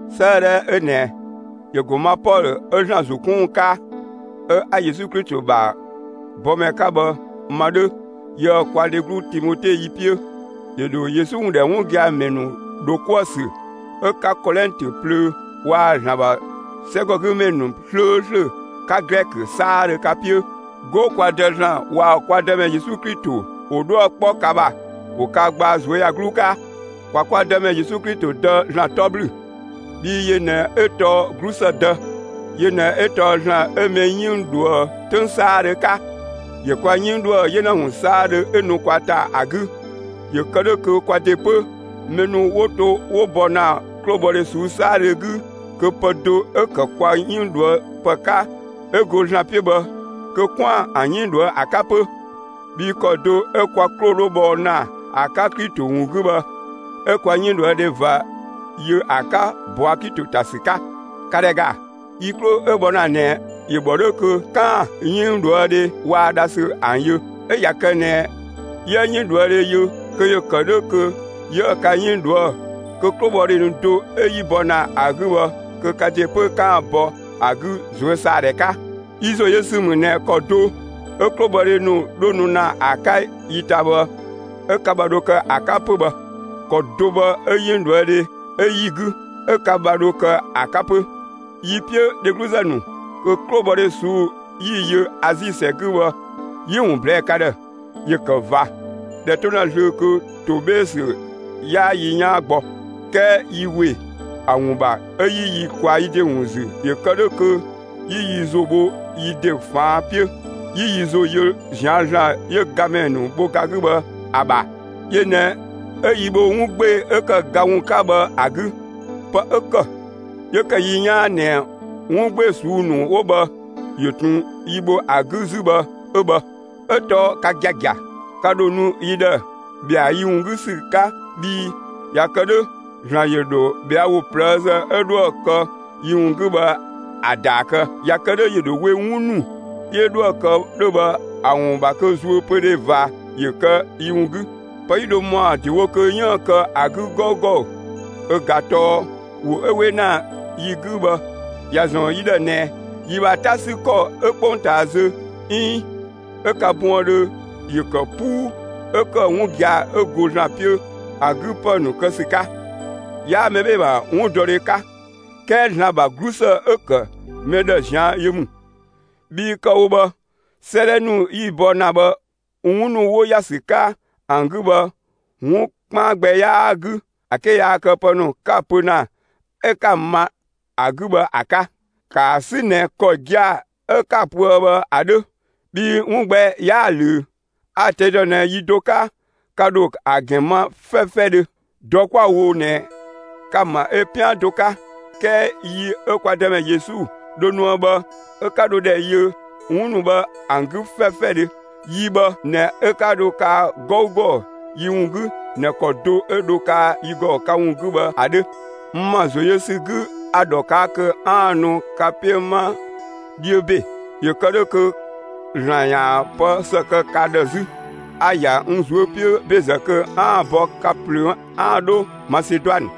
'Sëëdhɛ 'ö ꞊nɛ ‑yö ‑go ma Pɔlö 'ö ‑Zlan ‑zo 'kun ‑wun 'ka 'ö 'a Yesu Klito ‑bha bɔmɛ 'ka bhë ma 'dhö yië‑ kwa dheglu Timote yi 'piö. ‑Yö ‑dho Yesu ‑wun ‑dhɛ 'wun gia‑ ‑mɛ ‑nu ‑dho 'kuë‑ ‑sü 'ö 'ka Kolɛntö plöö waa‑ ‑Zlan ‑bha 'sɛgɔgümɛ ‑nu 'slööslö 'ka Glɛkö 'saadhö ka 'piö. 'Go, kwa Dë ‑Zlan waa‑ kwa Dëmɛ Yesu Klito ‑wo 'dhuë‑ 'kpɔ ka ‑bha, ‑wo ka gbaa ꞊zuöyagluu 'ka. ‑Kwa kwa Dëmɛ Yesu Klito Dë ‑Zlan 'tɔ ‑blü, bhii yö ꞊nɛ 'ö tɔɔ 'glusë Dë, yö ꞊nɛ 'ö tɔɔ ‑Zlan 'ö mɛ 'yënng ꞊dhuë' 'töng 'saadhö 'ka. ‑Yö kwa 'yënng ꞊dhuë' 'yena ‑wun 'saadhö 'ö nu kwa ‑ta ‑a 'gü, ‑yö kë 'dhö kö kwa ‑de 'pö mɛ ‑nu 'wo to 'wo bɔ ‑na 'klobhɔdhe ꞊suu'‑ 'saadhö 'gü kö pë do 'ö‑ ‑kë kwa 'yënng ꞊dhuë' ‑pë 'ka 'ö go ‑Zlan 'piö bhë kö 'kwaan‑ ‑an 'yënng ꞊dhuë' ‑a 'ka 'pö. Bhii ‑kɔ do 'ö kwa 'klo 'dho bhɔ ‑na ‑a 'ka Klito ‑wun 'gü bhë, 'ö kwa 'yënng ꞊dhuë' dhe ꞊va yö ‑a 'ka ꞊bɔa' Klito ‑ta ‑sü 'ka. ‑Ka ‑dhɛ ‑ga! Yi 'klo 'ö bhɔ ‑na ꞊nɛ ‑yö ‑bhɔ 'dhö kö 'kaan‑ 'yënngdhuëdhe waa‑ dhasü ‑an yö. 'Ö ꞊ya kë ꞊nɛ 'yië 'yënngdhuëdhe yö kö ‑yö ‑kë 'dhö kö 'yië ka 'yënng ꞊dhuë' kö 'klobhɔdhe ‑nu do 'ö 'yi bɔ ‑na ‑a 'gü bhë kö ka ‑de 'pö 'kaan‑ bɔ ‑a 'gü ꞊zuösaadhɛ 'ka. Yi ‑zo yö ‑sü ‑mü ꞊nɛ ‑kɔ do ö 'klobhɔdhe ‑nu 'dho nu ‑na ‑a 'ka yi ‑ta bhë 'ö ka ‑bha dho kë ‑a 'ka 'pö bhë, ‑kɔ do bhë 'ö 'yënngdhuëdhe 'ö 'yi‑ 'gü, 'ö ka ‑bha 'dho kë ‑a 'ka 'pö. Yi‑ 'piö, dhegluzë ‑nu, kö 'klobhɔdhe ꞊suu'‑ 'yi‑ yö Azi ‑sɛ 'gü bhë 'yi‑ ‑wun ꞊blɛɛ'‑ ka ‑dhë. ‑Yö ‑kë ꞊va, ꞊dhɛ 'to ‑na zlöö kö ‑to 'bhee‑ ‑sü 'yaa yi 'yaan gbɔ. 'Kɛɛ yi ‑we ‑a ‑wun ‑bha 'ö 'yi yi ꞊kwaa yi ‑de ‑wun ‑zü ‑yö kë 'dhö kö 'yi yi ‑zo bho yi ‑de ꞊faan' 'piö, 'yi yi ‑zo yö ꞊zian' ‑Zlan 'yö gamɛ ‑nu bho ga 'gü bhë ‑a ‑bha. Yö ꞊nɛ 'ö yi bho 'wun 'gbee‑ 'ö ‑kë ga ‑wun 'ka bhë ‑a 'gü; pë 'ö ‑kë 'yö ‑kë yi 'yaan ꞊nɛ 'wun 'gbee‑ ꞊suu'‑ ‑nu 'wo bhë ‑yö ꞊tun yi bho ‑an 'gü 'zü bhë 'ö bhë. 'Ö tɔɔ ka giagia, ka ‑dho nu yi ‑dhë ‑bhɛa yi ‑wun 'gü ‑sü 'ka bhii ꞊ya kë 'dhö ‑Zlan ‑yö ‑dho ꞊bhɛa' ‑wo ꞊plëëzë 'ö 'dhoë‑ kë yi ‑wun 'gü bhë ‑a ‑daa kë. ꞊Ya kë 'dhö ‑yö ‑dho we 'wun ‑nu 'yö 'dhoë‑ kë 'dhö bhë ‑a ‑wun ‑bha kö zuöpödhe ꞊va ‑yö kë yi ‑wun 'gü. Pë 'yi dho ‑mɔa ‑dewo kö 'yiën‑ kë ‑a 'gü 'gɔugɔ ö ꞊ga tɔɔ ‑wo 'ö 'we ‑na yi 'gü bhë ‑ya ‑zɔn yi ‑dhë ꞊nɛ yi ‑bha 'ta 'sü ‑kɔ 'ö 'kpongtaa zö 'iin 'ö ka buëndhö ‑yö ‑kë 'puu 'ö ‑kë 'wun gia‑ 'ö go ‑Zlan 'piö ‑a 'gü ‑pë ‑nu kë ‑sü 'ka. 'Yaa mɛ 'bhee‑ ‑bha 'wundɔdhe 'ka, 'kɛɛ ‑Zlan ‑bha 'glusë 'ö‑ ‑kë mɛ ‑dhë ꞊zian' yö ‑mü. Bhii kë‑ wo bhë, 'sëëdhɛ ‑nu yi‑ bɔ ‑na bhë, 'wun ‑nu 'wo ‑ya ‑sü 'ka ‑an 'gü bhë 'wun 'kpaan gbɛ 'yaa‑ 'gü ‑a 'ke yaa kë pë ‑nu 'ka‑ pö ‑na, 'ö 'ka‑ ma ‑a 'gü bhë ‑a 'ka. ‑Kaa 'sü ꞊nɛ ‑kɔ gia‑ 'ö 'ka‑ pöë bhë ‑a 'dhö, bhii 'wun gbɛ 'yaa‑ ꞊löö. A‑ ꞊tɛi' ‑dɔ ꞊nɛ yi do 'ka, ka ‑dho ‑a ‑gɛn ma 'fɛfɛdhö. Dɔ 'kwa‑ wo ꞊nɛ ka‑ ‑ma ö 'pian do 'ka. 'Kɛɛ yi 'ö kwa Dëmɛ Yesu dho nuë bhë 'ö 'ka dho ‑dhɛ yö 'wun ‑nu bhë ‑an 'gü 'fɛfɛdhö; yi bhë ꞊nɛ 'ö 'ka dho kaa 'gɔugɔ yi ‑wun 'gü ꞊nɛ ‑kɔ do 'ö dho kaa yi ‑gɔ ka ‑wun 'gü bhë ‑a 'dhö. N ‑ma ‑zo yö ‑sü 'gü a‑ ‑dhɔ ꞊kaa' kö 'aan‑ nu ka 'piö 'ma 'dhiö ‑be, ‑yö kë 'dhö kö ‑Zlan ‑yaan pë ‑së kë ka ‑dhë 'zü. A‑ ‑ya n ꞊zuö' 'piö ‑bezë kö 'aan‑ bɔ ka ꞊plöö 'aan‑ 'dho Maseduanë,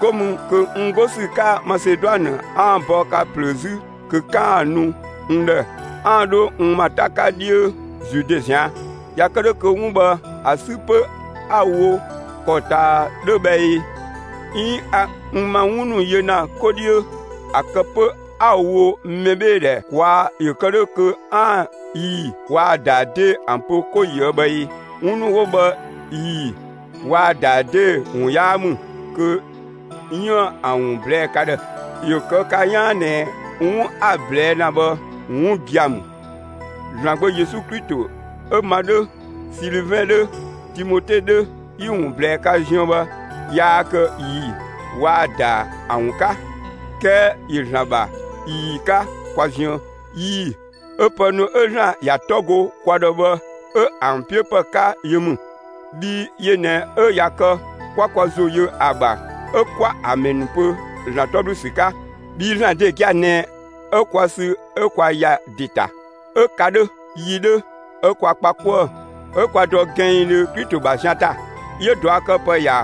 'go mü kö n 'go ‑sü 'ka Maseduanë 'aan‑ bɔ ka ꞊plöö 'zü kö 'kaan‑ nu n ‑dhë 'aan‑ 'dho n ‑ma 'ta 'ka 'dhiö Zude ꞊zian'. ꞊Ya kë 'dhö kö 'wun bhë ‑a 'sü 'pö 'a‑ wo ‑kɔ ꞊taa 'dhö bhë ꞊ee? 'Iin a n ‑ma 'wun ‑nu yö ‑na 'ko 'dhiö, ‑a kë 'pö 'a‑ wo mɛbheedhɛ ‑kwaa ‑yö kë 'dhö kö 'aan‑ ꞊ii‑ waa‑ ‑daa 'dee‑ ‑an pö 'ko ꞊yië' bhë ꞊ee? 'Wun ‑nu 'wo bhë ꞊ii‑ waa‑ ‑daa 'dee‑ ‑wun 'yaa ‑mü kö 'yiën‑ ‑an ‑wun ꞊blɛɛ'‑ ka ‑dhë. ‑Yö kë ka 'yaan ꞊nɛ 'wun 'a‑ ꞊blɛɛ' ‑na bhë 'wun gia‑ ‑mü. ‑Zlan Gbö Yesu Klito 'ö ma 'dhö, Silivɛn 'dhö, Timote 'dhö, 'yi‑ ‑wun ꞊blɛɛ ka ziën bhë yaa kë ꞊ii‑ waa‑ ‑daa ‑an ‑wun 'ka, 'kɛɛ ‑yö ‑Zlan ‑bha ꞊ii‑ 'ka kwa ziën. ꞊Ii‑ 'ö pë ‑nu 'ö ‑Zlan ‑ya 'tɔ go kwa ‑dhë bhë 'ö ‑an 'piö ‑pë 'ka yö ‑mü. Bhii yö ꞊nɛ 'ö ꞊ya kë 'kwa kwa ‑zo yö ‑a ‑bha 'ö 'kwa amɛn pö ‑Zlan 'tɔ ‑blü ‑sü 'ka. Bhii ‑Zlan ‑de gia‑ ꞊nɛ 'ö kwa sü 'ö kwa ‑ya ‑de ‑ta 'ö ka 'dhö, yi 'dhö 'ö kwa kpa 'kuë‑ 'ö kwa dɔ gɛnngdhö Klito ‑bha zian ‑ta. 'Yö ꞊duakëpë ‑ya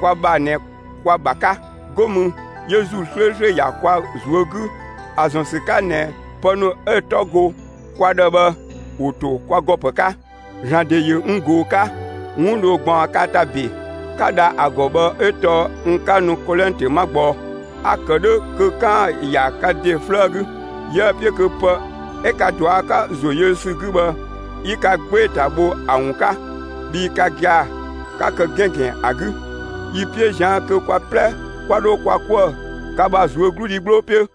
kwa ‑bha ꞊nɛ kwa‑ ‑bha 'ka, 'go mü 'yö ‑Zuu 'slööslö ‑ya kwa ꞊zuö' 'gü ‑a ‑zɔn ‑sü 'ka ꞊nɛ pë ‑nu 'ö‑ 'tɔ go kwa ‑dhë bhë ‑wo ‑to kwa ‑gɔ ‑pë 'ka. ‑Zlan ‑de ‑yö n ꞊goo‑ 'ka. 'Wun dho ꞊gbaɔn ka ‑ta ‑be, 'ka dha ‑a ‑gɔ bhë 'ö tɔɔ n 'ka nu Kolɛntö 'ma gbɔ. A‑ kë 'dhö kö 'kaan‑ ‑ya ka ‑de 'flëë 'gü. 'Yiëë‑ 'piö kö pë 'ö ka ꞊dua' 'ka ‑zo yö ‑sü 'gü bhë 'yi ka 'gbee‑ ‑ta bho ‑a ‑wun 'ka, bhii ka gia‑ 'ka kë 'gɛngɛn ‑a 'gü. Yi‑ 'piö ꞊zian' kö kwa 'plɛ 'kwa 'dho kwa 'kuë‑ ka ‑bha ꞊zuögludhi 'gbloo 'piö.